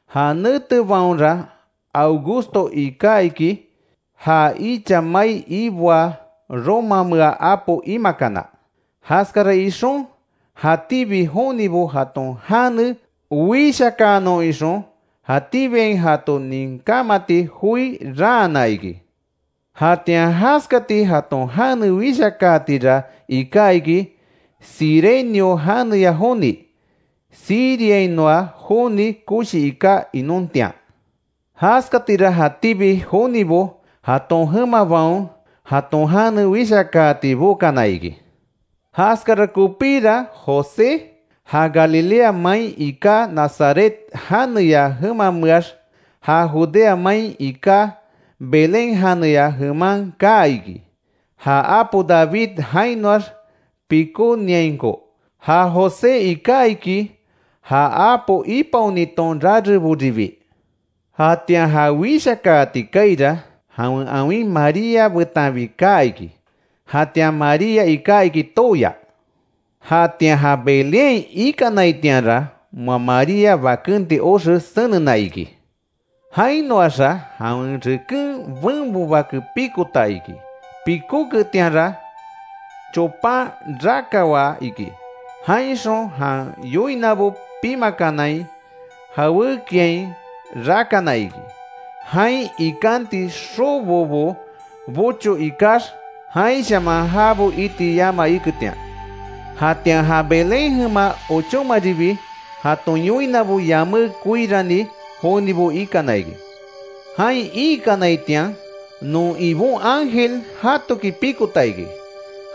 Ja netebaonra Augusto iká iki, ja icha mai iboaa romamea apo imakana. Jaskara ixon, jatíbi jonibo jaton jane wishakaanon ixon, jatíbiain jato ninkámati joi raana iki. Jatian jaskati jaton jane wishakaatira iká iki, Cirenio janeya joni, Siriainoa joni koshi iká inontian. Jaskatira jatíbi jonibo jaton jemabaon jaton jane wishakaati bokana iki. Jaskara kopíra José, ja Galilea main iká Nazaret janeya jemameax, ja Judea main iká Belén janeya jeman kaa iki, ja apo David jainoax pikóniainko. Ja José iká iki ja apo ipaoniton rareboribi. Jatian ja wishakaati kaaira, jawen awin María betanbi kaa iki, jatian María iká iki tooya. Jatian ja Belénhain ikanaitianra, moa María bakenti oxe senena iki. Jainoaxa, jawen reken benbo bake pikota iki; pikóketianra chopan rakawaa iki, jainxon jan yoinabo pimakanai jawékiain rakana iki. Jain ikanti xobobo bocho ikax jainshaman jabo iti yama iketian. Jatian ja Belén jema ochómaribi, jaton yoinabo yamé koirani jonibo ikana iki. Jain iikanaitian, non Ibon ángel jatoki pikota iki.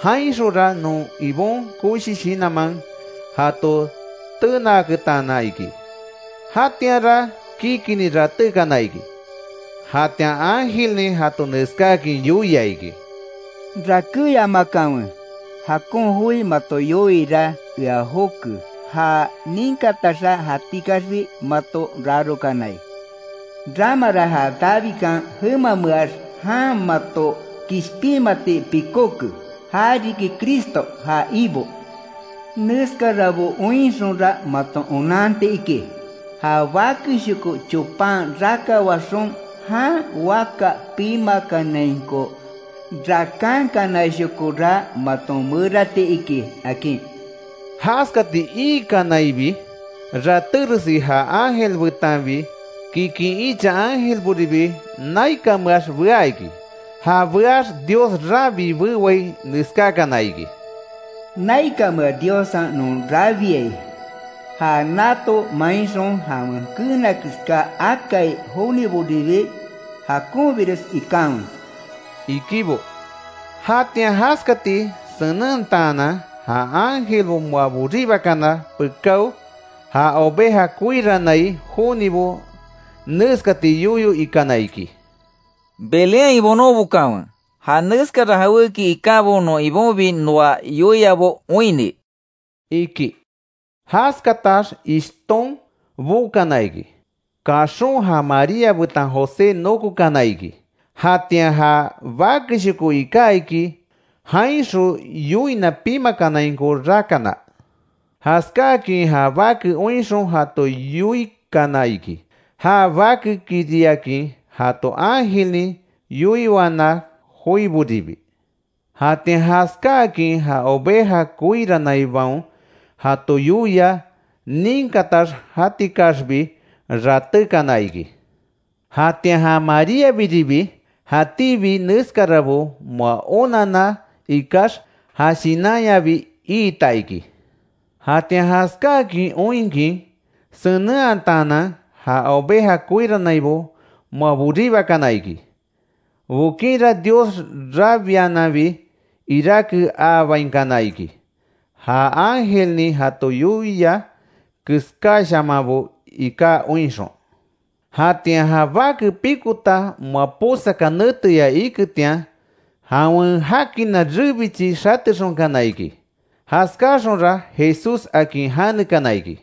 Jainxonra non Ibon koshi shinanman jato tenaaketana iki; jatianra kikinni ratékana iki. Jatian ángelnin jato neskáakin yoia iki: “Rakéyamakanwe, jakon joi mato yoiira, ea joke ja ninkataxa jatikaxbi mato rarokanai. Ramara ja Davidkan jemameax jan mato kishpinmati pikóke, ja riki Cristo, ja Ibo. Neskarabo oinxonra maton onanti iki: Ja bakeshoko chopan rakawaxon jan waka pimakanainko rakankanashokora maton merati iki”, akin. Jaskati iikanaibi ratéresi ja ángel betanbi, kikin icha ángelboribi naikanmeax bea iki. Ja beax Dios rabii bewai neskákana iki: “¡Naikamea Diossa non rabiai! ¡Ja nato mainxon jawen keena keská akai joniboribi, jakonbires ikanwe!” ikibo. Jatian jaskati senentaanan ja ángelbo moa boríbakana pekáo, ja oveja koirannai jonibo neskati yoyo ikana iki: —Belénhain bonon bokanwe, ja neskara jawéki ikábo non Ibonbi noa yoiabo oinni —iki. Jaskatax ishton bokana iki, kaxon ja María betan José nokokana iki, jatian ja bakeshoko iká iki, jainxon yoina pimakanainko rakana. Jaskáakin ja bake oinxon jato yoikana iki, ja bakekiriakin jato ángelnin yoiwana joiboribi. Jatian jaskáakin ja oveja koiranaibaon jato yoia ninkatax, jatikaxbi ratékana iki. Jatian Maríabiribi jatíbi neskarabo moa onanna ikax, ja shinanyabi iita iki. Jatian jaskáakin oinkin senenhataanan, ja oveja koiranaibo moa boribakana iki. Bokinra Dios rabiananbi iráke aabainkana iki; ja ángelnin jato yoia keskáshamanbo iká oinxon. Jatian ja bake pikota moa posaka neteya iketian, jawen jakina rebichi xatexonkana iki. Jaskáaxonra JESÚS, akin janekana iki.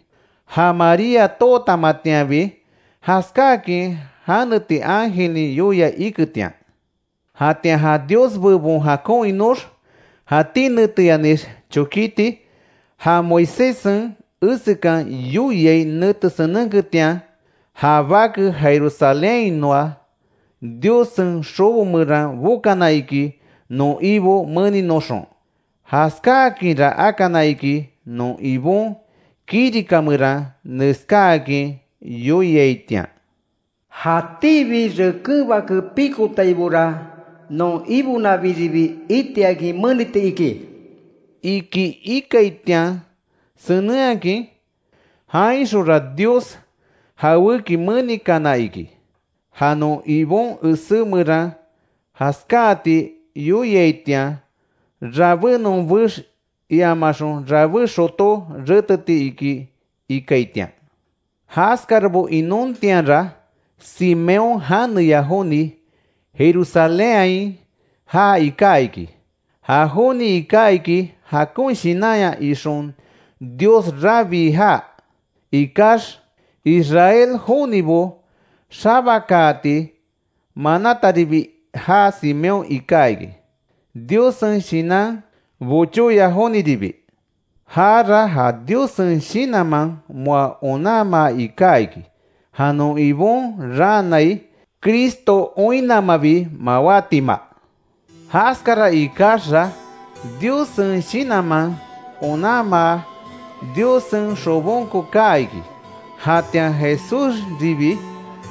Ja María tootamatianbi, jaskáakin janeti ángelnin yoia iketian. Jatian ja Dios bebon jakon inox, jatí neteyanix chokíti, ja Moiséssen esekan yoiai nete senenketian, ja bake Jerusalénhainoa Diossen xobo meran bokana iki non Ibo meninoxon. Jaskáakinra akana iki, non Ibon kirika meran neskáakin yoiaitian: “Jatíbi reken bake pikotaibora non Ibonabiribi itiakin meniti iki”, iki ikaitian senenhakin. Jainxonra Dios jawéki menikana iki; ja non Ibon esé meran jaskáati yoiaitian, rabé nonbex iamaxon rabé xotó reteti iki ikaitian. Jaskarabo inontianra, Simeón janeya joni, Jerusalénhain jaa iká iki. Ja joni iká iki jakon shinanya ixon Dios rabii jaa ikax, Israel jonibo xabakaati manataribi. Ja Simeón iká iki, Diossen Shinan bochóya joniribi. Jara ja Diossen Shinanman moa onanmaa iká iki, ja non Ibon raanai Cristo oinnamabi mawátima. Jaskara ikaxa Diossen Shinanman onanmaa, Diossen xobonko kaa iki. Jatian Jesúsribi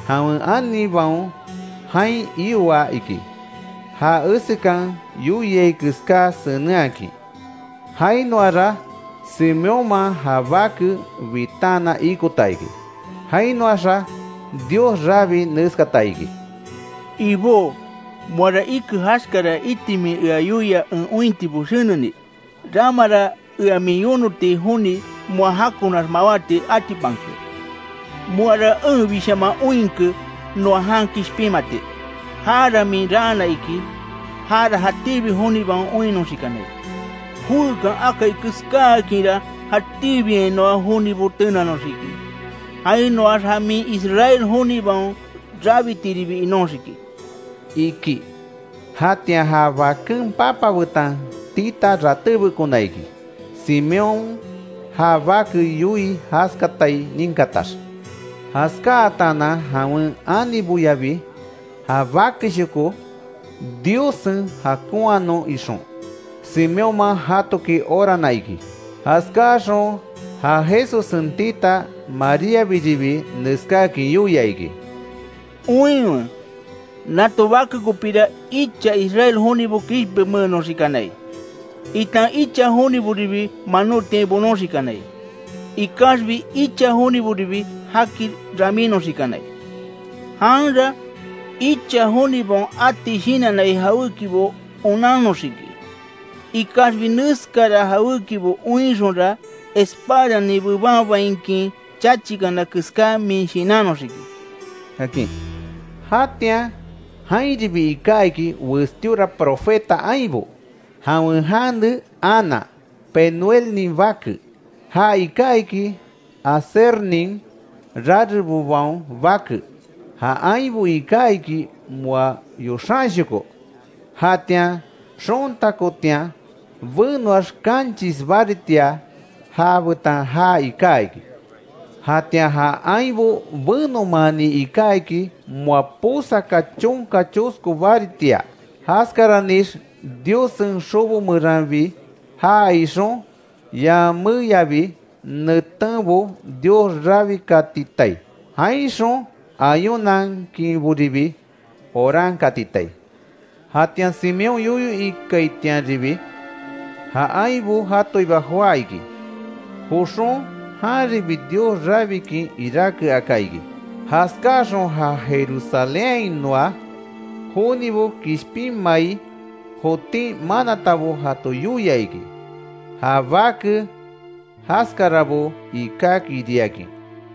jawen anibaon jain ioa iki, ja esekan yoiai keská senenhakin. Jainoara Simeónman ja bake bitaanan ikota iki. Jainoaxa Dios rabii neskata iki: “Ibó, moara ike jaskara iti min ea yoia en ointibo seneni, ramara ea min yonoti joni moa jakonax mawáti atipanke. Moara enbishaman oinke noa jan kishpinmati. Jara min raana iki; jara jatíbi jonibaon oinnoxikanai. Joékan akai keskáakinra jatíbiainoa jonibo tenanoxiki, jainoax ja min Israel jonibaon rabitiribi inóxiki”, iki. Jatian ja baken papa betan tita ratébekona iki; Simeón ja bake yoii jaskatai ninkatax. Jaskátaanan jawen aniboyabi ja bakeshoko Diossen jakonhanon ixon, Simeónman jatoki orana iki. Jaskáxon ja Jesussen tita Maríabiribi neskáakin yoia iki: —Oinwe, nato bake kopira icha Israel jonibo kishpinmeenoxikanai, itan icha joniboribi manótiain bonoxikanai; ikaxbi icha joniboribi jaki ramínoxikanai. Janra icha jonibaon ati shinannai jawékibo onannoxiki. Ikaxbi neskara jawékibo oinxonra espadanin bebanbainkin chachikana keská min shinannoxiki —akin. Jatian jainribi ika iki westíora profeta ainbo, jawen jane Ana, Penuelnin bake, ja iká iki Asernin rarebobaon bake, ja ainbo iká iki moa yoxanshoko. Jatian xontakotian benoax kanchis baritia, já betan jaa iká iki. Jatian ja ainbo benomaani iká iki moa posaka chonka chosko baritia. Jaskaranix Diossen xobo meranbi jaa ixon, yaméyabi netenbo Dios rabikatitai, jainxon ayunankinboribi orankatitai. Jatian Simeón yoyo ikaitianribi, ja ainbo jatoiba joá iki; joxon janribi Dios rabikin iráke aka iki. Jaskáaxon ja Jerusalénhainoa jonibo kishpinmai jotin manatabo jato yoia iki, ja bake jaskarabo ikákiriakin.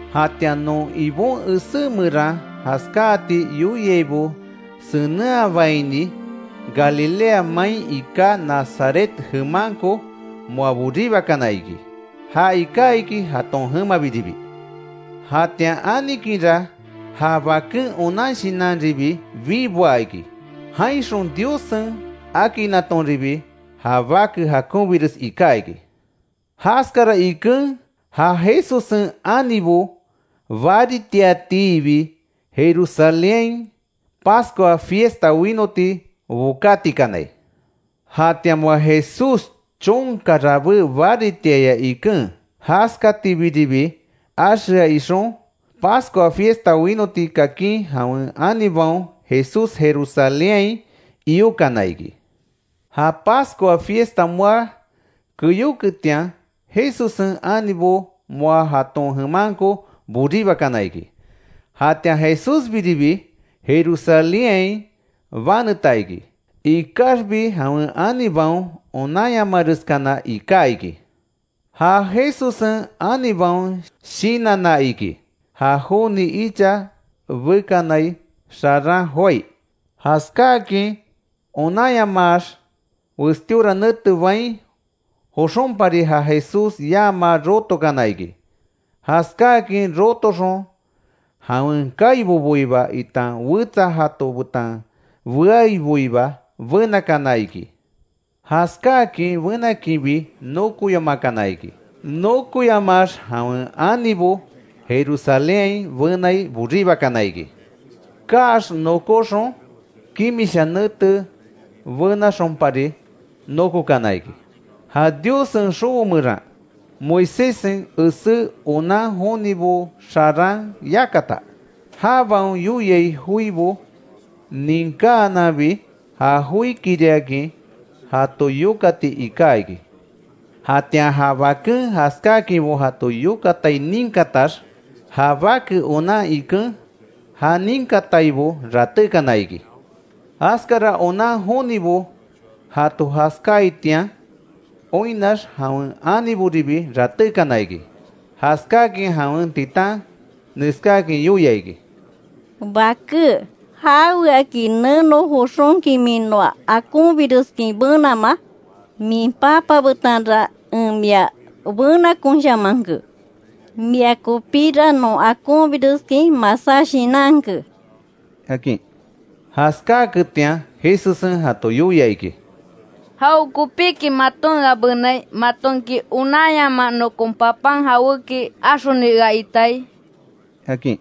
Jatian non Ibon esé meran jaskáati yoiaibo senenhabaini, Galilea main iká Nazaret jemanko moa boribakana iki, ja iká iki jaton jemabiribi. Jatian anikinra ja baken onan shinanribi biboa iki, jainxon Diossen akinatonribi, ja bake jakonbires iká iki. Jaskara iken ja Jesussen anibo, baritiatiibi Jerusalénhain Pascua fiesta winoti bokátikanai. Jatian moa Jesús chonka rabé baritiaya iken, jaskatibiribi axea ixon, Pascua fiesta winoti kakin, jawen anibaon Jesús Jerusalénhain iokana iki. Ja Pascua fiesta moa keyóketian, Jesussen anibo moa jaton jemanko boríbakana iki. Jatian Jesúsbiribi Jerusalénhain baneta iki. Ikaxbi jawen anibaon onanyamareskana iká iki. Ja Jesussen anibaon shinanna iki, ja joni icha bekanai xaran joái. Jaskáakin onanyamaax, westíora nete bain joxónpari, ja Jesús yamaa rotokana iki. Jaskáakin rotoxon jawen kaiboboiba itan wetsa jato betan beaiboiba benakana iki. Jaskáakin benakinbi nokoyamakana iki, nokoyamaax jawen anibo Jerusalénhain benai boribakana iki. Kaax nokóxon kimisha nete benaxonpari nokokana iki; ja Diossen xobo meran, Moiséssen esé onan jonibo xaran yakata. Jabaon yoiai joibo ninkáananbi ja joikiriakin jato yokati iká iki. Jatian ja baken jaskáakinbo jato yokatai ninkatax, ja bake onan iken, ja ninkataibo ratékana iki. Jaskara onan jonibo jato jaskáaitian oinnax, jawen aniboribi ratékana iki; jaskákin jawen titan neskáakin yoia iki: —Baké, ¿Jaweaki neno joxonki min noa akonbireskin benamaa? Min papa betanra en mia benakonshamanke. Mia kopira, non akonbireskin masá shinanke —akin. Jaskáaketian Jesussen jato yoia iki: —¿Jawekopiki maton ea benai? ¿Matonki onanyamaa, nokon papan jawéki axoni ea iitai? —akin.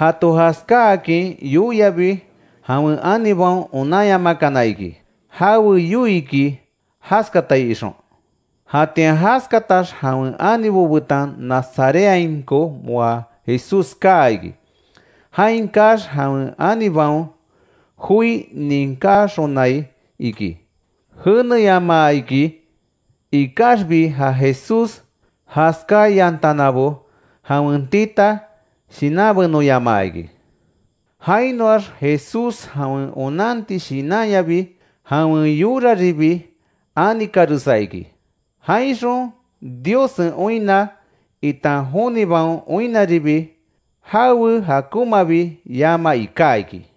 Jato jaskáakin yoiabi jawen anibaon onanyamakana iki, jawe yoiiki jaskatai ixon. Jatian jaskatax jawen anibo betan Nazarethainko moa Jesús kaa iki. Jain kaax jawen anibaon joi ninkáxonai iki jenéyamaa iki. Ikaxbi ja Jesús jaskáyantanabo jawen tita shinanbenoyamaa iki. Jainoax Jesús jawen onanti shinanyabi, jawen yoraribi anikaresa iki. Jainxon Diossen oinna itan jonibaon oinnaribi, jawe jakonmabi yama iká iki.